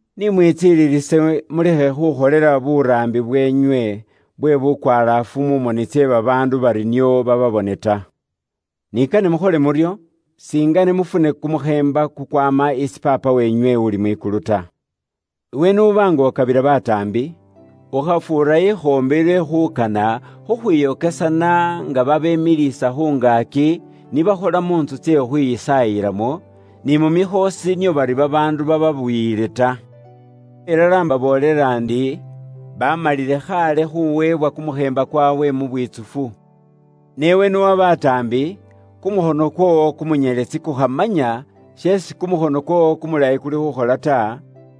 “Ni mwitsililise mulekhe khukholela buraambi bweenywe bwe bukwalaafu mu moni tsye babaandu bari nio bababone ta. Ni kane mukhole muryo, singene mufune kumukheemba kukwaama isi Paapa weenywe uli mwikulu ta. “Iwe n'uba nga ukabila bataambi, ukhafuura ikhoombi lwe khuukana khukhwiyokesana nga babemiliisa khu ngaaki ni bakhola mu ntsu tsye khukhwisaayilamo, ni mu mikhoosi nio bari babaandu babaabuyile ta. Ilala imbaboolela ndi, baamalile khaale khuweebwa kumukheemba kwaabwe mu bwitsufu. Ne iwe n'uwa bataambi, kumukhono kwoowo kumunyeletsi kukhamanya sheesi kumukhono kwoowo kumulayi kuli khuukhola ta,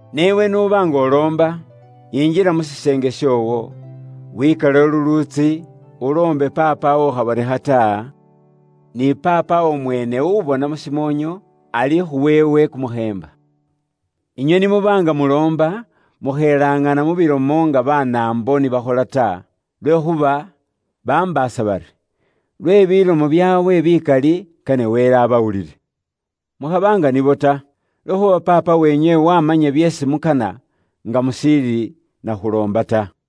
Ne iwe n'uba nga uloomba, yinjila mu shiseenge shoowo, wikalewo lulwiitsi, uloombe Paapawo ukhabonekha ta, ni Paapawo mweene ubona mu shimoonyo, alikhuwa iwe kumukheemba. Inywe ni muba nga muloomba, mukhelaŋana mu bilomo nga Banaambo ni bakhola ta. Lwekhuuba nibo bambaasa bari, lwe bilomo byaabwe bikali kane Wele abawulile. Mukhaba nga nibo ta, lwekhuuba Paapa weenywe wamanya byeesi mukana nga mushiili nakhuloomba ta.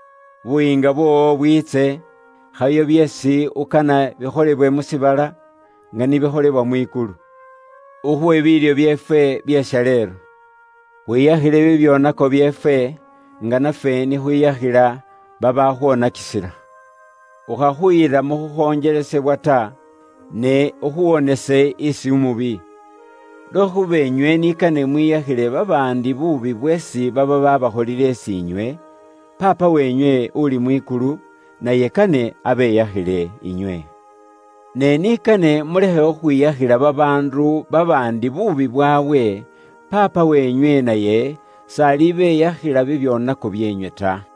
Buyiinga bwoowo bwiitse, khayo byeesi ukana bikholebwe mu shiibala, nga ni bikholebwa mwikulu. Ukhuwe biilyo byeefwe bye shaleelo. Khwiyakhile bibyoonako byeefwe, nga nafwe ni khwiyakhila babaakhwonakisila. Ukhakhuyila mu khukhonjelesebwa ta, ne ukhuwonese isi umubi.’ “Lwekhuuba inywe ni kane mwiyakhile babaandi buubi bweesi baba bakholile isi inywe, Paapa weenywe uli mwikulu naye kane abeyakhile inywe. Ne ni kane mulekhe khukhwiyakhila babaandu babaandi buubi bwaabwe, Paapa weenywe naye s'alibeyakhila bibyoonako byeenywe ta.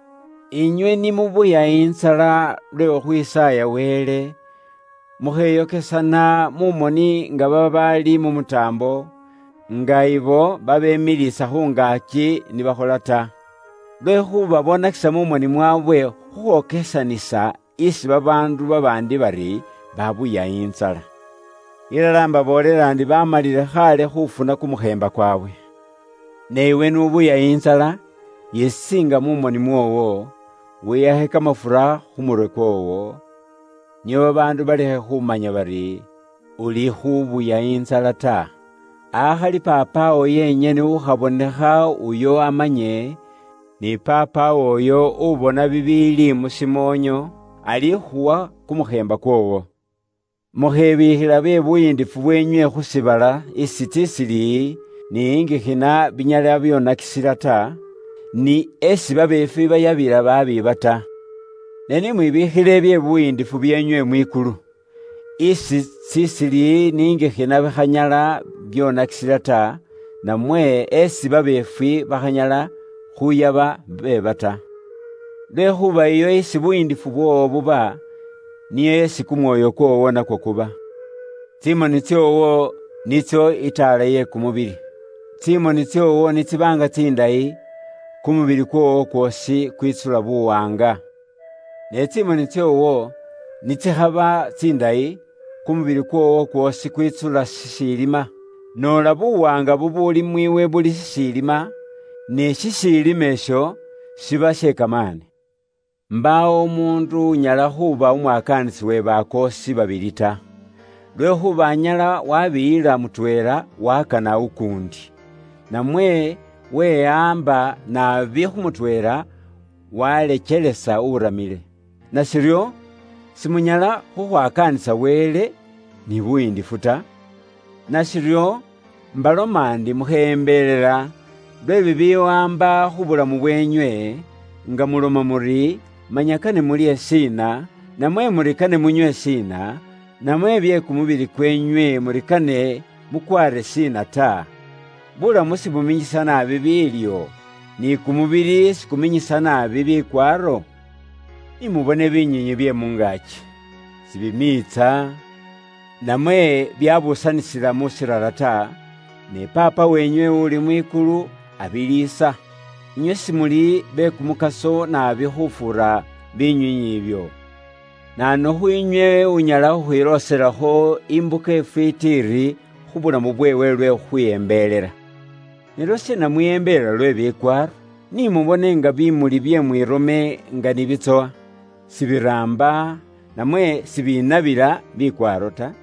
“Inywe ni mubuya intsala lwe khukhwisaaya Wele, mukheyokesana mu moni nga babaali mu mutaambo, nga ibo babemiliisa khu ngaaki ni bakhola ta. Lwekhuuba boonakisa mu moni mwaabwe khukhwokesanisa isi babaandu babaandi bari babuya intsala. Ilala imbaboolela ndi baamalile khaale khuufuna kumukheemba kwaabwe. Ne iwe n'ubuya intsala, yisiinga mu moni mwoowo, wihakhe kamafura mu murwe kwoowo, nio babaandu balekhe khumanya bari, ulikhubuya intsala ta, akhali Paapawo yenyene ukhabonekha uyo amanye, ni Paapawo uyo ubona bibiili mu shimoonyo alikhuwa kumukheemba kwoowo. “Mukhebiikhila bye buyiindifu bweenywe khu shiibala isi tsisilili, ni ingikhina binyala byoonakisila ta, ni esi babeefwi bayabila baabiiba ta. Ne ni mwibiikhile bye buyiindifu bweenywe mwikulu, isi tsisilili ni ingikhina bikhanyala byoonakisila ta, namwe esi babeefwi bakhanyala khuyaba beeba ta. Lwekhuuba iyo isi buyiindifu bwoowo buba, niyo esi kumwoyo kwoowo nakwo kuba. “Tsimoni tsoowo nitso itaala ye kumubili. Tsimoni tsoowo ni tsiba nga tsindayi, kumubili kwoowo kwoosi kwitsula buwaanga. Ne tsimoni tsoowo ni tsikhaba tsindayi, kumubili kwoowo kwoosi kwitsula shishiilima. Noola buwaanga bubuuli mwiiwe buli shishiilima, ni shishiilima isho shiba she kamaani! “Mbaawo umuundu unyala khuuba umwakaanisi uwe bakoosi babili ta, lwekhuuba anyala waabiyila mutweela, waakana ukuundi, namwe wehaamba naabi khu mutweela, waalekelesa uramile. Nashiryo, simunyala khukhwakaanisa Wele ni buyiindifu ta. “Nashiryo, imbaloma ndi mukheyembelela lwe bibiwaamba khu bulamu bweenywe, nga muloma muri, manya kane mulye shiina, namwe muri kane munywe shiina, namwe bye kumubili kweenywe muri kane mukwaare shiina ta. Buulamu sibuminyisa naabi biilyo, ni kumubili sikuminyisa naabi bikwaaro? Ni mubone binywiinywi bye mu ngaaki; sibimiitsa, namwe byabuusanisila mu shiirara ta, ne Paapa weenywe uli mwikulu abiliisa. Inywe simuli be kumukaso naabi khufuura binywiinywi ibyo? Naanu khwiinywe unyala khukhwilooselakho imbuka ifwiiti iri khu bulamu bweewe lwe khukhwiyembelela? “Ne lwashiina mwiyembelela lwe bikwaaro? Ni mubone nga bimuli bye mwirome nga ni bitsowa, sibiraamba, namwe siibinabila bikwaaro ta.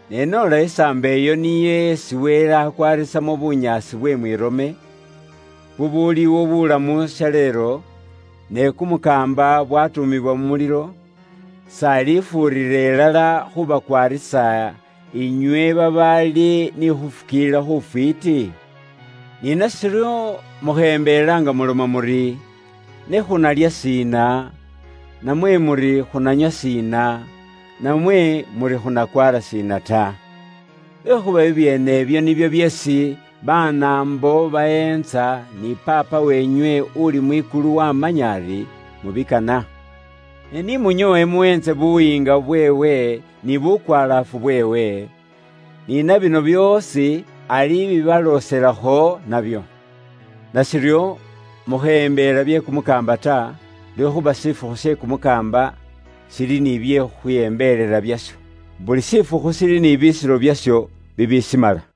Ne noola isaambo iyo niyo isi Wele akwaarisamo bunyaasi bwe mwirome, bubuuliwo buulamu shaleelo, ne kumukaamba bwaatuumibwa mu mulilo, s'alifuurira ilala khuubakwaarisa, inywe babaali ni khuufukiilila khufwiiti? “Ni nashiryo, mukheyembelela nga muloma muri, ne khunalya shiina? Namwe muri khunanywa shiina? Namwe muri khunakwaara shiina ta? Lwekhuuba bibyeene ibyo nibyo byeesi Banaambo baweentsa, ni Paapa weenywe uuli mwikulu waamanya ari mubikana. Ne ni munyoowe muweentse Buyiinga bweewe ni bukwalaafu bweewe, ni na bino byoosi alibibalooselakho nabyo. Nashiryo, mukheyembelela bye kumukaamba ta, lwekhuuba shifukhu she kumukaamba shiri ni bye khukhwiyembelela byasho. Buli shifukhu shiri ni bisiro byasho bibishimala.